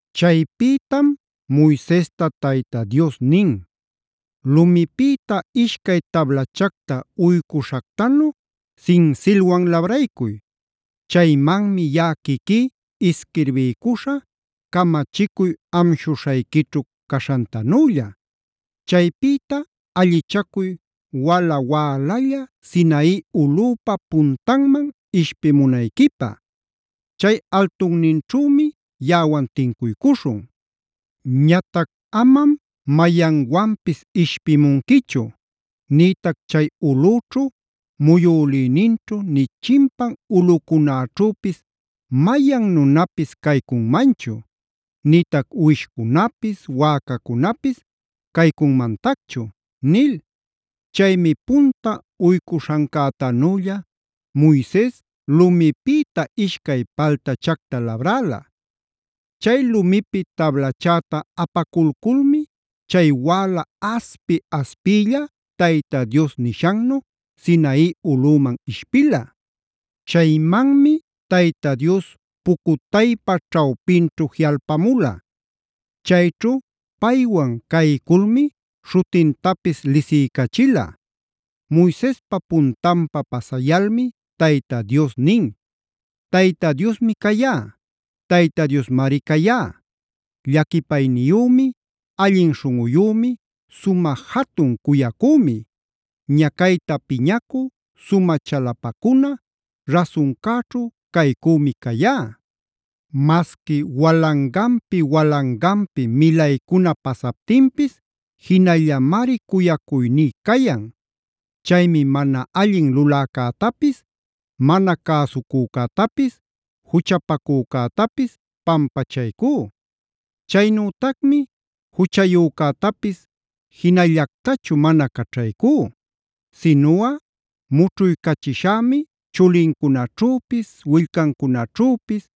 Chaypïtam Moisesta Tayta Dios nin: “Lumipïta ishcay tablachacta uycuśhactanu sinsilwan labraycuy. Chaymanmi yaꞌa quiquí isquirbiycuśhä camachicuy amshuśhayquićhu caśhantanülla. Chaypïta allichacuy wala-wälalla Sinai ulꞌüpa puntanman ishpimunayquipä. Chay altunninćhümi yaꞌawan tincuycuśhun. Ñatac amam mayanwanpis ishpimunquichu. Nïtac chay ulꞌüćhu, muyülïninćhu nï chimpan ulꞌucunäćhüpis mayan nunapis caycunmanchu; nïtac uwishcunapis, wäcacunapis caycunmantacchu” nil. Chaymi punta uycuśhancätanülla Moises lumipïta ishcay paltachacta labräla. Chay lumipi tablachäta apaculculmi chay wäla aspi-aspiylla Tayta Dios nishannu Sinai ulꞌüman ishpila. Chaymanmi Tayta Dios pucutaypa ćhawpinćhu jiꞌalpamula. Chayćhu paywan cayculmi śhutintapis lisiycachila. Moisespa puntanpa pasayalmi Tayta Dios nin: “¡Tayta Diosmi cayá! ¡Tayta Diosmari cayá! llaquipayniyümi, allin śhunꞌuyümi, sumä jatun cuyacümi; ñacayta piñacü, sumä chalapacuna, rasuncäćhu caycümi cayá. Masqui walanganpi-walanganpi milaycuna pasaptinpis jinallamari cuyacuyní cayan. Chaymi mana allin luläcätapis, mana cäsucücätapis, juchapacücätapis pampachaycú. Chaynütacmi juchayücätapis jinallactachu mana caćhaycú. Sinuꞌa mućhuycachishämi chulincunaćhüpis, willcancunaćhüpis,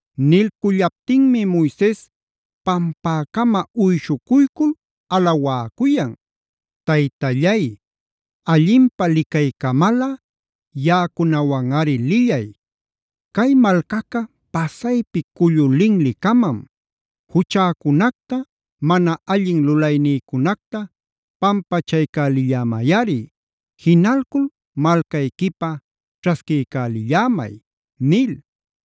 Nilcullaptinmi Moises pampäcama uyshucuycul alawäcuyan: “Taytallay, allinpä licaycamalꞌa yaꞌacunawanꞌari lillay. Cay malcaca pasaypi cullu linli-camam. Juchäcunacta, mana allin lulaynïcunacta pampachaycälillämayꞌari. Jinalcul malcayquipä ćhasquiycälillämay” nil.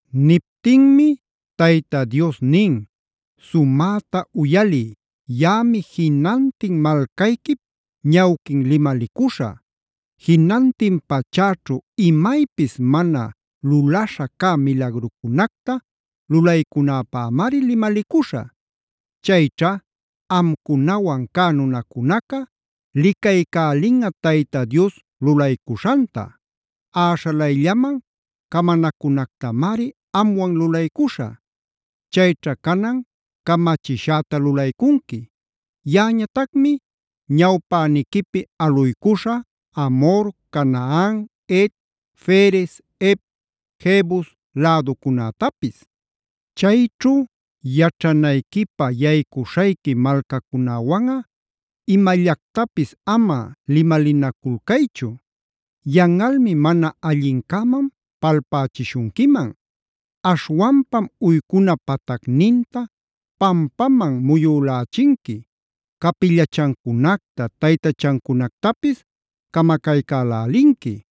Niptinmi Tayta Dios nin: “Sumäta uyaliy, yaꞌami jinantin malcayquip ñawquin limalicuśhä. Jinantin pachäćhu imaypis mana lulaśha cä milagrucunacta lulaycunäpämari limalicuśhä. Chayćha amcunawan cä nunacunaca licaycälinꞌa Tayta Dios lulaycuśhanta; äśhalayllaman camanacunactamari amwan lulaycuśhä. “Chayćha canan camachishäta lulaycunqui. Yaꞌañatacmi ñawpäniquipi aluycuśhä Amhor, Canaan, Het, Ferez, Hev, Jebus läducunätapis. “Chayćhu yaćhanayquipä yaycuśhayqui malcacunäwanꞌa imallactapis ama limalinaculcaychu. Yanꞌalmi mana allincäman palpälächishunquiman. Aśhwanpam uycuna patacninta pampaman muyülächinqui, capillachancunacta, taytachancunacta camacaycälälinqui;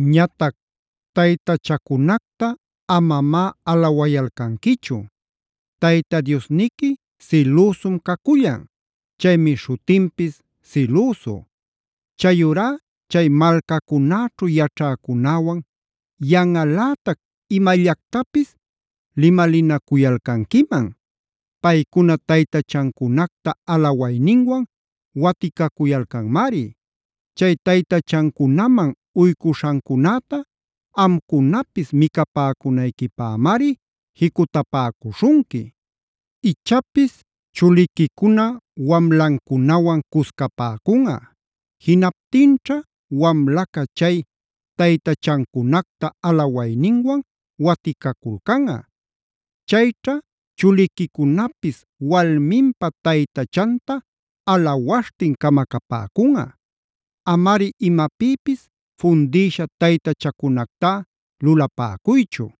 “Ñatac taytachacunacta amamá alawayalcanquichu; Tayta Diosniqui sïlüsum cacullan. Chaymi śhutinpis ‘Silüsu’. “Chayurá chay malcacunäćhu yaćhäcunäwan yanꞌalätac imallactapis limalinacuyalcanquiman. Paycuna taytachancunacta alawayninwan waticacuyalcanmari. Chay taytachancunaman uycuśhancunäta amcunapis micapäcunayquipämari jicutapäcuśhunqui. Ichapis chuliquicuna wamlancunawan cuscapäcunꞌa. Jinaptinćha wamlaca chay taytachancunacta alawayninwan waticaculcanꞌa. Chayćha chuliquicunapis walminpa taytachanta alawaśhtin camacapäcunꞌa. “Amari imapïpis fundïsha taytachacunactá lulapäcuychu.c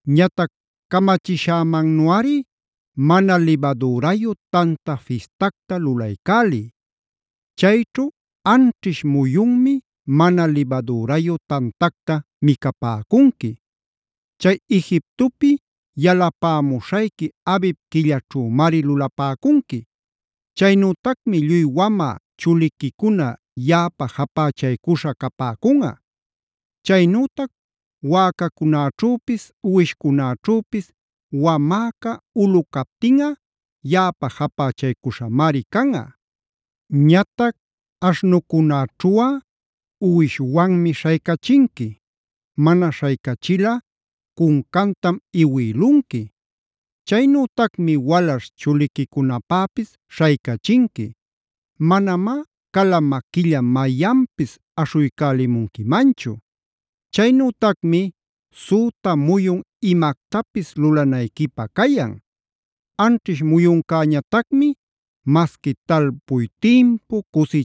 “Ñatac camachishämannuꞌari Mana Libadürayu Tanta Fistacta lulaycäliy.d Chayćhu anćhish muyunmi mana libadürayu tantacta micapäcunqui. Chay Egiptopi yalapämuśhayqui Abib quillaćhümari lulapäcunqui. “Chaynütacmi lluy wamä chuliquicuna yaꞌapä japächaycuśhä capäcunꞌa.e Chaynütac wäcacunäćhüpis, uwishcunäćhüpis wamäca ulu captinꞌa yaꞌapä japächaycuśhämari canꞌa. Ñatac aśhnucunäćhuꞌa uwishwanmi śhaycachinqui; mana śhaycachilꞌa cuncantam iwïlunqui.f Chaynütacmi walaśh chuliquicunapäpis śhaycachinqui. Manamá cala maquilla mayanpis aśhuycälimunquimanchu. “Chaynütacmi süta muyun imactapis lulanayquipä cayan. Anćhish muyuncäñatacmi masqui talpuy timpu,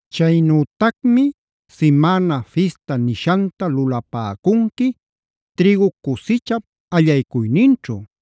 “Chaynütacmi ‘Simäna Fista’ nishanta lulapäcunqui trïgu cusichap allaycuyninćhu.h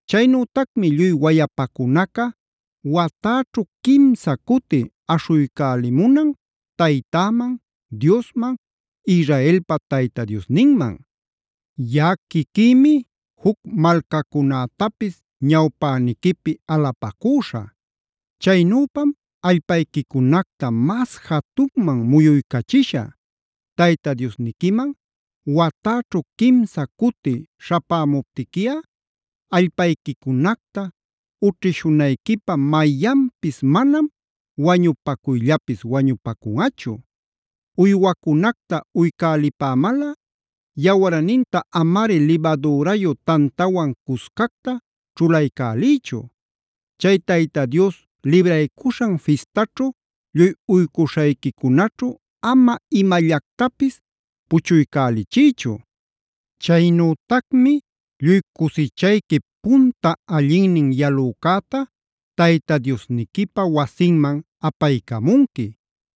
“Chaynütacmi lluy wayapacunaca watäćhu quimsa cuti aśhuycälimunan Taytäman, Diosman, Israelpa Tayta Diosninman. Yaꞌa quiquïmi juc malcacunätapis ñawpäniquipi alapacüśhä. Chaynüpam allpayquicunacta mas jatunman muyuycachishä. Tayta Diosniquiman watäćhu quimsa cuti śhapämuptiquiꞌa allpayquicunacta ućhishunayquipä mayanpis manam wañupacuyllapis wañupacunꞌachu. “Uywacunacta uycälipämalꞌa yawarninta amari libadürayu tantawan cuscacta ćhulaycäliychu. Chay Tayta Dios Libraycuśhan Fistaćhuj lluy uycuśhayquicunaćhu ama imallactapis puchuycälichiychu. “Chaynütacmi lluy cusichayquip punta allinnin yalücäta Tayta Diosniquipa wasinman apaycamunqui.k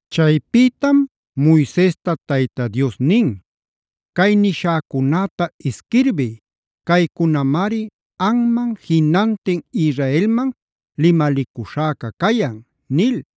Chaypïtam Moisesta Tayta Dios nin: “Cay nishäcunäta isquirbiy. Caycunamari anman, jinantin Israelman limalicuśhäca cayan” nil.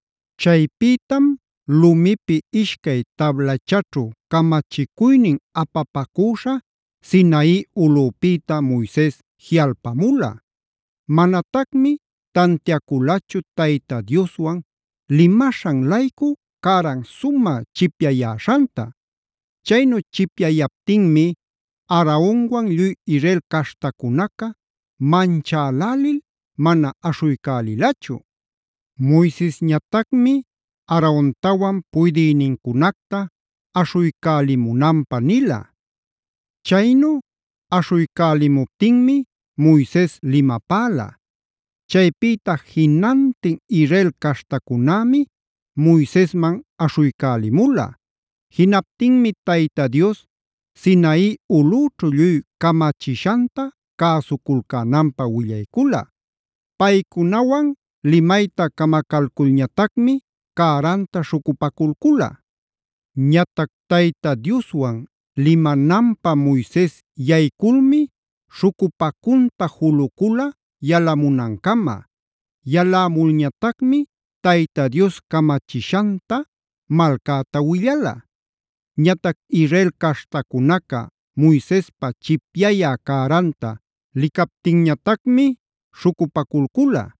Chaypïtam lumipi ishcay tablachaćhu camachicuynin apapacüśha Sinai ulꞌüpïta Moises jiꞌalpamula. Manatacmi tantiaculachu Tayta Dioswan limaśhan-laycu cäran sumä chipyayäśhanta. Chaynu chipyayaptinmi Aaronwan lluy Israel caśhtacunaca manchälälil mana aśhuycälilachu. Moisesñatacmi Aarontawan puydïnincunacta aśhuycälimunanpä nila. Chaynu aśhuycälimuptinmi Moises limapäla. Chaypïta jinantin Israel caśhtacunämi Moisesman aśhuycälimula. Jinaptinmi Tayta Dios Sinai ulꞌüćhu lluy camachishanta cäsuculcänanpä willaycula. Paycunawan limapayta camacalculñatacmi cäranta śhucupaculcula. Ñatac Tayta Dioswan limananpä Moises yayculmi śhucupacunta julucula yalamunancama. Yalämulñatacmi Tayta Dios camachishanta malcäta willala. Ñatac Israel caśhtacunaca Moisespa chipyayä cäranta licaptinñatacmi śhucupaculcula.